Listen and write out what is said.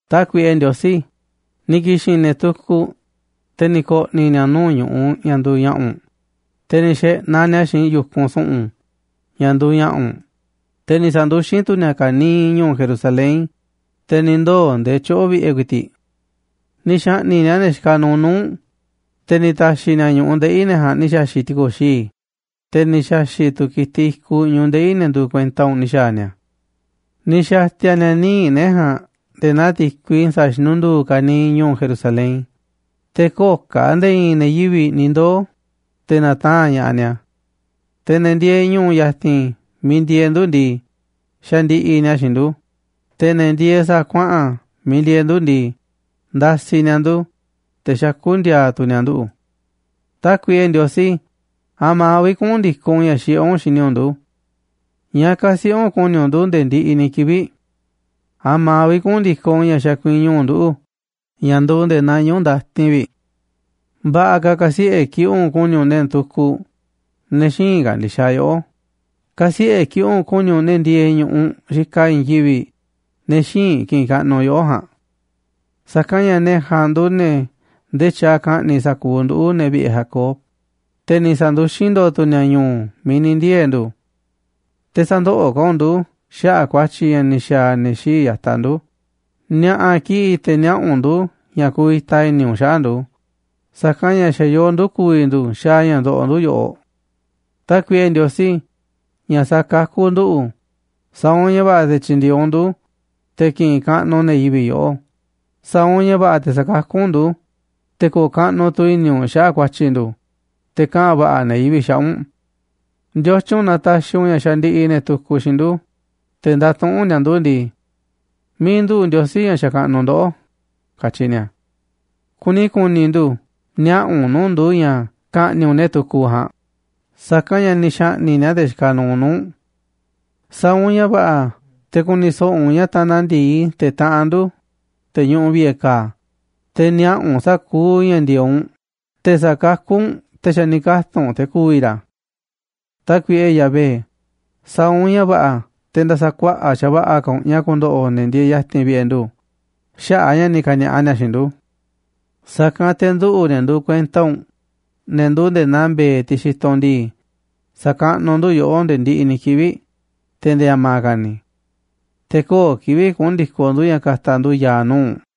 Tákuiꞌe Ndiosí, ni̱ ki̱xi̱n ne̱ tukuꞌ, te̱ ni̱ ko̱ꞌni̱ ni̱a̱ nuu̱ꞌ ñu̱ꞌuꞌ ña̱ nduuꞌ ña̱ꞌa̱ u̱nꞌ, te̱ ni̱ xe̱ꞌnaꞌ ni̱a̱ xiinꞌ yu̱kunꞌ su̱ꞌu̱n ña̱ nduuꞌ ña̱ꞌa̱ u̱nꞌ, te̱ ni̱ sa̱nduxín tu̱ ni̱a̱ ka̱niiꞌ ñu̱u̱ Jerusalén, te̱ ni̱ ndoo̱ nde̱e̱ tyoꞌo̱ vi̱ꞌe̱ ku̱i̱ti̱ꞌ. Ni̱ xa̱ꞌni̱ꞌ ni̱a̱ ne̱ xikaꞌ nuuꞌ nuu̱ꞌ u̱nꞌ, te̱ ni̱ ta̱xi̱ ni̱a̱ ñu̱ꞌuꞌ ndeꞌi̱ ne̱ ja̱a̱nꞌ ni̱ xa̱xi̱ꞌ ti̱ko̱xii̱, te̱ ni̱ xa̱xi̱ꞌ tu̱ ki̱tiꞌ i̱kuꞌ ñu̱ꞌuꞌ ndeꞌi̱ ne̱ nduuꞌ kuenta u̱nꞌ ni̱ xa̱a̱ ni̱a̱. Ni̱ xa̱ti̱a̱ ni̱a̱ níiꞌ ne̱ ja̱a̱nꞌ nde̱e̱ naa ti̱kui sa̱a̱ xinundu̱u̱ ka̱niiꞌ ñu̱u̱ Jerusalén, te̱ köo̱ꞌ ka̱ nde̱e̱ i̱i̱n ne̱ yivi̱ꞌ ni̱ ndoo̱, te̱ na̱taa̱nꞌ ña̱ꞌaꞌ ni̱a̱. Te̱ ne̱ ndieeꞌ ñu̱u̱ ya̱ti̱n miiꞌ ndieeꞌ ndu̱ ndii, xandiꞌiꞌ ni̱a̱ xiinꞌ ndu̱, te̱ ne̱ ndieeꞌ sa̱a̱ kuaꞌa̱n miiꞌ ndieeꞌ ndu̱ ndii, ndasiꞌ ni̱a̱ ndu̱, te̱ xakú ndi̱a̱a̱ tu̱ ni̱a̱ nduꞌu̱. Tákuiꞌe Ndiosí, ¿a̱ma̱ vi̱ꞌ kuꞌu̱n ndi̱koꞌ u̱nꞌ ña̱ xiꞌé u̱nꞌ xini u̱nꞌ ndu̱? ¿Ñáá ka̱siꞌe̱ u̱nꞌ ku̱ni̱ u̱nꞌ ndu̱ nde̱e̱ ndiꞌiꞌ ni̱ kivi̱ꞌ? ¿A̱ma̱ vi̱ꞌ kuꞌu̱n ndi̱koꞌ ña̱ xakuiñu u̱nꞌ nduꞌu̱ ña̱ nduuꞌ nde̱e̱ naa ñuꞌu̱ ndatin vi̱ꞌ? Va̱ꞌa̱ ka̱ ka̱siꞌe̱ kiꞌi̱ꞌ u̱nꞌ ku̱ni̱ u̱nꞌ ne̱ tukuꞌ, ne̱ xïinꞌ ka̱ndi̱xaꞌ yoꞌó, ka̱siꞌe̱ kiꞌi̱ꞌ u̱nꞌ ku̱ni̱ u̱nꞌ ne̱ ndieeꞌ ñu̱ꞌuꞌ xikaꞌ i̱i̱n yivi̱ꞌ, ne̱ xïinꞌ ki̱ꞌi̱n kaꞌnuꞌ yoꞌó ja̱a̱nꞌ. Sa̱kanꞌ ña̱ ne̱ ja̱a̱nꞌ nduuꞌ ne̱ ndee tyaaꞌ ka̱ꞌni̱ꞌ sa̱kuuꞌ nduꞌu̱, ne̱ vi̱ꞌe̱ Jacob, te̱ ni̱ sa̱nduxín ndo̱o̱ tu̱ ni̱a̱ ñu̱u̱ miiꞌ ni̱ ndiee̱ ndu̱. Te̱ sä̱ndoꞌoꞌ ka̱ u̱nꞌ ndu̱ xaꞌa̱ꞌ ku̱a̱tyi̱ ña̱ ni̱ xa̱a̱ ne̱ xii̱ꞌ ya̱taꞌ ndu̱, ni̱a̱ꞌa̱ kiꞌi̱ꞌ te̱ niaꞌa̱ u̱nꞌ ndu̱ ña̱ kuvita i̱ni̱ u̱nꞌ xaꞌa̱ꞌ ndu̱, sa̱kanꞌ ña̱ xa̱ yoo ndu̱ ku̱vi̱ ndu̱ xaaꞌ ña̱ ndoꞌoꞌ ndu̱ yoꞌoꞌ. Tákuiꞌe Ndiosí, ña̱ sakakú nduꞌu̱, sa̱a̱ u̱nꞌ ña̱ va̱ꞌa̱ te̱ tyi̱ndi̱e̱eꞌ u̱nꞌ ndu̱, te̱ ki̱ꞌi̱n kaꞌnuꞌ ne̱ yivi̱ꞌ yoꞌó. Sa̱a̱ u̱nꞌ ña̱ va̱ꞌa̱ te̱ sa̱kakú u̱nꞌ ndu̱, te̱ ko̱o̱ kaꞌnuꞌ tu̱ i̱ni̱ u̱nꞌ xaꞌa̱ꞌ ku̱a̱tyi̱ ndu̱, te̱ kaꞌa̱n va̱ꞌa̱ ne̱ yivi̱ꞌ xaꞌa̱ꞌ u̱nꞌ. Ndiotyun na taxiꞌ u̱nꞌ ña̱ xandiꞌiꞌ ne̱ tukuꞌ xiinꞌ ndu̱, te̱ ndatuꞌúnꞌ ni̱a̱ ndu̱ ndii: “¿Miiꞌ nduꞌu̱ꞌ Ndiosí, ña̱ xakaꞌnuꞌ ndoꞌó?”, katyi ni̱a̱. Kuni ku̱ni̱ ndu̱ niaꞌa̱ u̱nꞌ nuu̱ꞌ ndu̱ ña̱ ka̱ꞌni̱ꞌ u̱nꞌ ne̱ tukuꞌ ja̱a̱nꞌ, sa̱kanꞌ ña̱ ni̱ xa̱ꞌni̱ꞌ ni̱a̱ ne̱ xikaꞌ nuuꞌ nu̱ꞌ u̱nꞌ. Sa̱a̱ u̱nꞌ ña̱ va̱ꞌa̱ te̱ ku̱ni̱ so̱ꞌo̱ u̱nꞌ ña̱ tanaꞌ ndi̱i te̱ taꞌanꞌ ndu̱, te̱ ñuꞌuꞌ vi̱ꞌe̱ ka̱a̱, te̱ niaꞌa̱ u̱nꞌ sa̱kuuꞌ ña̱ ndi̱e̱eꞌ u̱nꞌ te̱ sa̱kakú u̱nꞌ te̱ xa̱ ni̱ katu̱nꞌ te̱ ku̱vi̱ ra̱. Tákuiꞌe Yahvé, sa̱a̱ u̱nꞌ ña̱ va̱ꞌa̱ te̱ nda̱sa̱ kuaꞌa̱ꞌ xa̱va̱ꞌa̱ ka̱ u̱nꞌ ña̱ ku̱ndo̱ꞌo̱ ne̱ ndieeꞌ ya̱ti̱n vi̱ꞌe̱ ndu̱ xaꞌa̱ꞌ a̱ ña̱ ni̱ ka̱ni̱a̱ꞌa ni̱a̱ xiinꞌ u̱nꞌ. Sa̱kanꞌ te̱ nduꞌu̱, ne̱ nduuꞌ kuenta u̱nꞌ, ne̱ nduuꞌ nde̱e̱ naa mbe̱e̱, tiꞌ xitoꞌ u̱nꞌ ndii, sa̱kaꞌnuꞌ ndu̱ yoꞌó nde̱e̱ ndiꞌiꞌ ni̱ kivi̱ꞌ, te̱ nde̱e̱ a̱ma̱ ka̱ ni̱. Te̱ köo̱ꞌ kivi̱ꞌ kuꞌu̱n ndi̱koꞌ ndu̱ ña̱ ka̱ta̱ ndu̱ ya̱a̱ nuu̱ꞌ u̱nꞌ.